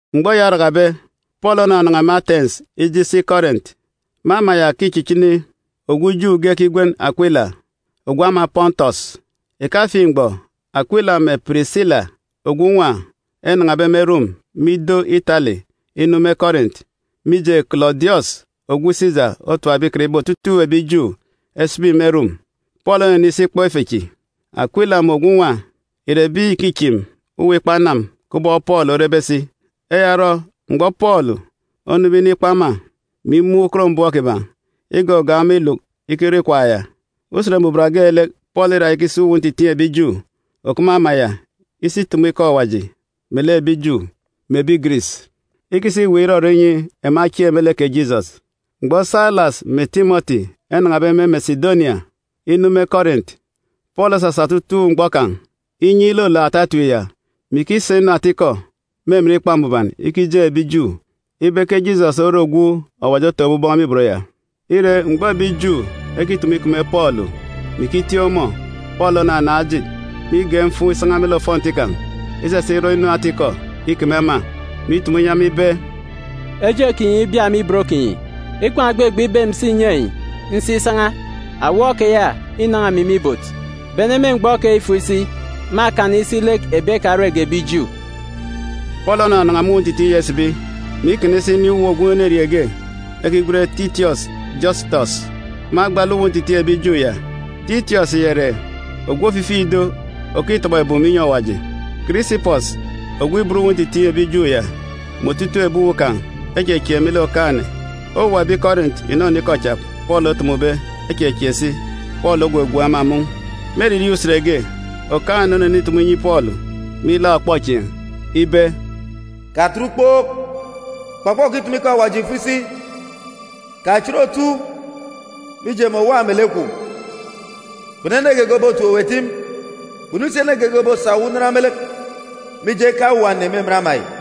Mgbọ eya orakabe, Pọọlu onanan̄a me Atens ije isi Kọrint. Me ama ya ke îchichini ogwu Ju ge ekigwen Akwila, ogwu ama Pọntọs. Ìkafiin̄ mgbọ Akwila mè Pirisila ogwu nwa enan̄abe me Rom me ido Itali inu me Kọrint, mije Kọlọdiọs ogwu Sisa otapbe ikan ibe otutuuk ebi Ju esibi me Rom. Pọọlu onenisi ikpọ ife chi. Akwila mè ogwu nwa ìre ebi ìkichim uwu ọfọ kubọk Pọọlu orebe si. Eya orọ, mgbọ Pọọlu onube inikpọ ema, mè imun̄ ukot mbọm kiban̄, igọgọọk ema iluk ikirọ ikwaan̄ ya. Usen Mbuban geelek, Pọọlu îra ikisi uwu ntitiin̄ ebi Ju òkup me ama ya isi itumu ikọ Awaji inyi ebi Ju mè ebi Giris, ikisa iweek irọrọ inyi ema echieek me lek kè Jisọs. Mgbọ Sailas mè Timọti enan̄abe me Mesidonia inu me Kọrint, Pọọlu osasa otutuuk mgbọ kan̄ inyi ilolook ata etip ya, mè ikisa inu ata-ikọ me emen Ikpa Mbuban ikijeen̄ ebi Ju ibe ke Jisọs ore ogwu Awaji otọkọbe aran̄ me ibot ya. Ire, mgbọ ebi Ju ekitumu ikeme Pọọlu, mè ikitiik ọmọ, Pọọlu onanaan̄ ejit, mè igen̄ mfuun̄ isan̄a me lek ofọnti kan̄ isasa irọ inu ata-ikọ ikeme ema, mè itumu inyi ema ibe, “Kè eje kinyi ibia me ibot kinyi! Ikwaan̄ ògbegbe ibe emi ǹsi ǹnyi enyi, nsi isan̄a. Awọ keya înan̄a emi me ibot. Bene me mgbọ keyi fo isi, mâkana isi lek ebi ekarege ebi Ju.” Pọọlu onanan̄a me uwu ntitiin̄ ya isibi, mè ikana isi inin̄ uwu ogwu enerieen̄ ge ekigwen Titiọs Jọsitọs me agba lek uwu ntitiin̄ ebi Ju ya. Titiọs ya ìre ogwu ofifi ido òkitọbọ ebum inyi Awaji. Kirisipọs ogwu ibot uwu ntitiin̄ ebi Ju ya mè otutuuk ebi uwu kan̄ echechieek me lek Okaan̄-ene. Owuwa ebi Kọrint ìnọnọ ikọ cha Pọọlu otumube echechieek si. Pọọlu ogwogwook ema mun̄. Me eririeen̄ usen ge, Okaan̄-ene onenitumu inyi Pọọlu me ilaak ọkpọchieen̄ ibe, “Katet ukpook! Kpọkpọ kitumu ikọ Awaji fo isi! Kachit otu! Mije, emi òwa melek kwun̄. Kpunu ene geege òbotim owu etim, kpunu si ene geege òbosak owu unan me lek. Mije, nkaan̄ owuwa ene me emen ama yi.”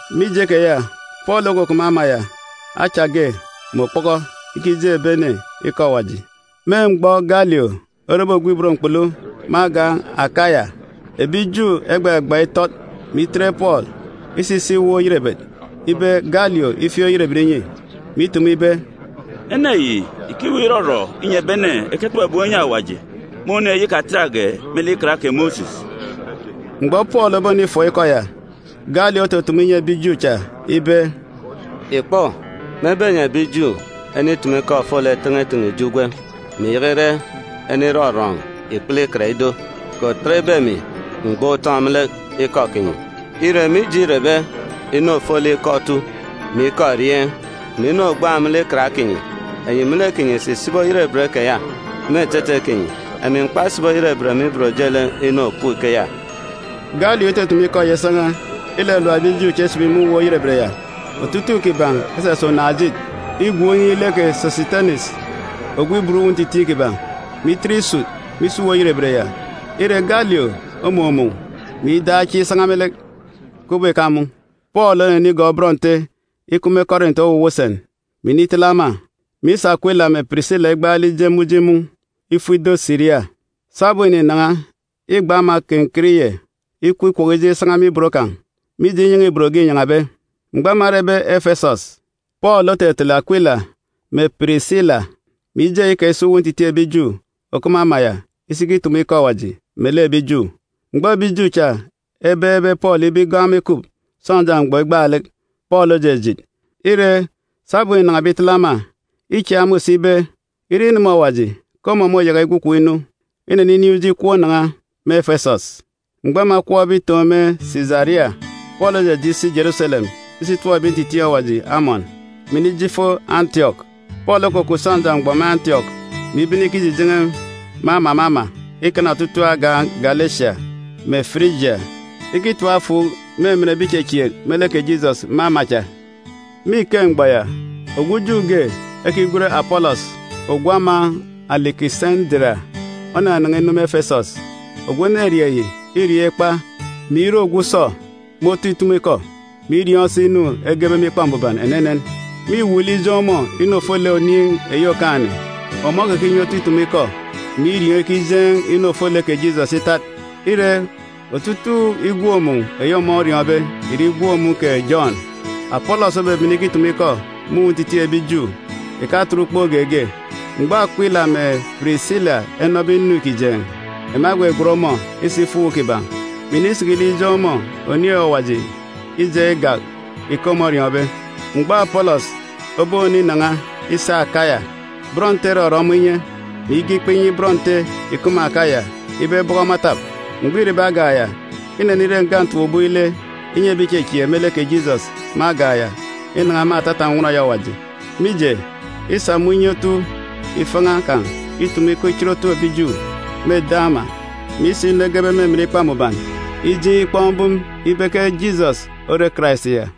Mije keya, Pọọlu okukup me ama ya acha ge mè okpọkọ ikijeen̄ ebi ene ikọ Awaji. Me mgbọ Galio orebe ogwu ibot mkpulu me agan̄ Akaya, ebi Ju egbagbaan̄ itọt, mè itet Pọọlu isa isi uwu oyerebet ibe Galio ifieek oyerebet inyi, mè itumu ibe, “Ene yi ìkiweek irọrọ inyi ebi ene eketọbọ ebum enyi Awaji me oniin̄ eyi ikatatge me lek Ikan kè Mosis.” Mgbọ Pọọlu obonifọọk ikọ ya, Galio otutumu inyi ebi Ju cha ibe, “Ìkpọ, mebe enyi ebi Ju enitumu ikọ ofolek ten̄eten̄e ijo ugwem, mè ìyaka ire ene irọrọn̄ ikpele ikan ido, kè òtat ibe emi m̀gban̄ utọn̄ me lek ikọ kinyi. Ire, mije îrebe inu ofolek ikọ otu, mè ikọ erieen̄, mè inu ògbaan̄ me lek Ikan kinyi, enyi me lek kinyi ìsi ìsibi oyerebet keya me etete kinyi. Emi m̀kpasibi oyerebet me ibot ojelek inu òkup ikeya.” Galio itutumu ikeya isan̄a, ilalap ebi Ju cha isibi me uwu oyerebet ya. Otutuuk kiban̄ esasa unaan̄-ejit igwook inin̄ lek kè Sọsitenis ogwu ibot uwu ntitiin̄ kiban̄, mè itet isut me isi uwu oyerebet ya. Ire, Galio omumun̄, mè idaan̄ chieen̄ isan̄a me lek, kubọk ìkamun̄. Pọọlu onenigọọk bọn Nte ikup me Kọrint owuwa usen, mè initele ema, mè isa Akwila mè Pirisila igbaalek ije me uji mun̄ ifo ido Siria. Sabum îninan̄a, îgba ama Kenkiriye ikup ikwọkọ ijeek isan̄a mè ibot kan̄, mije inyan̄a-ibot ge înyan̄abe. Mgbọ ema erebe Efesọs, Pọọlu otetele Akwila mè Pirisila, mè ije eyi kan̄ isi uwu ntitiin̄ ebi Ju òkup me ama ya isi ikitumu ikọ Awaji melek ebi Ju. Mgbọ ebi Ju cha ebeekbe Pọọlu ibe igọọk ema ikup sọnja mgbọ igbaalek, Pọọlu ojijit. Ire, sabum înan̄abe itele ema, îchieek ema use ibe, ire ineme Awaji, ke ọmọ môyaka igwu ikom inu. Ineninin̄ uji ikọp inan̄a me Efesọs. Mgbọ ema ekọpbe itoon̄ me Sisaria, Pọọlu ojeje isi Jeruselem isi itọp ebi ntitiin̄ Awaji amọn, mè inije ifo Antiọk. Pọọlu okukup sọnja mgbọ me Antiọk, mè ibene ikijijen̄e me ama me ama ikana otutuuk agan̄ Galesia mè Firijia ikitap efuuk me emen ebi ìchechieek me lek kè Jisọs me ama cha. Me ike mgbọ ya, ogwu Ju ge ekigwen Apọlọs ogwu ama Alikisendira, onanan̄a inu me Efesọs. Ogwu enerieen̄ yi îriọọn̄ ikpa, mè ire ogwu usọ me otu itumu-ikọ, mè iriọọn̄ si inu egebe me Ikpa Mbuban enenen. Mîwuuk lek ijeen̄ ọmọ inu ofolek Oniin̄ eyi Okaan̄-ene, ọmọ okekinye otu itumu ikọ, mè iriọọn̄ ikijeen̄ inu ofolek kè Jisọs itat. Ire, otutuuk igwook-mun̄ eyi ọmọ oriọọn̄be ìre igwook-mun̄ kè Jọn. Apọlọs obebene ikitumu ikọ me uwu ntitiin̄ ebi Ju, ìkatet ukpook geege. Mgbọ Akwila mè Pirisila enọbe inu îkijeen̄, ema egwegwen ọmọ isa ifo uwu kiban̄, mè inisiki lek ijeen̄ ọmọ Oniin̄ eyi Awaji ijaan̄ igak ike ọmọ oriọọn̄be. Mgbọ Apọlọs oboninan̄a isi Akaya, bọn Nte erọrọ ọmọ inye, mè ige ikpa inyi bọn Nte ìkup me Akaya ibe ebọkọ ọmọ etap. Mgbọ îrebe agan̄ ya, inenire nga ntap-ubọk ile inyi ebi ìchechieek me lek kè Jisọs me agan̄ ya inan̄a me atata nnwọn eyi Awaji. Mije, îsa me unye otu ifan̄a kan̄ itumu ikọ ichit otu ebi Ju me eden̄ ama, mè isa inu egebe me emen Ikpa Mbuban ijeen̄ ikpọk mbum ibe ke Jisọs ore Karais ya.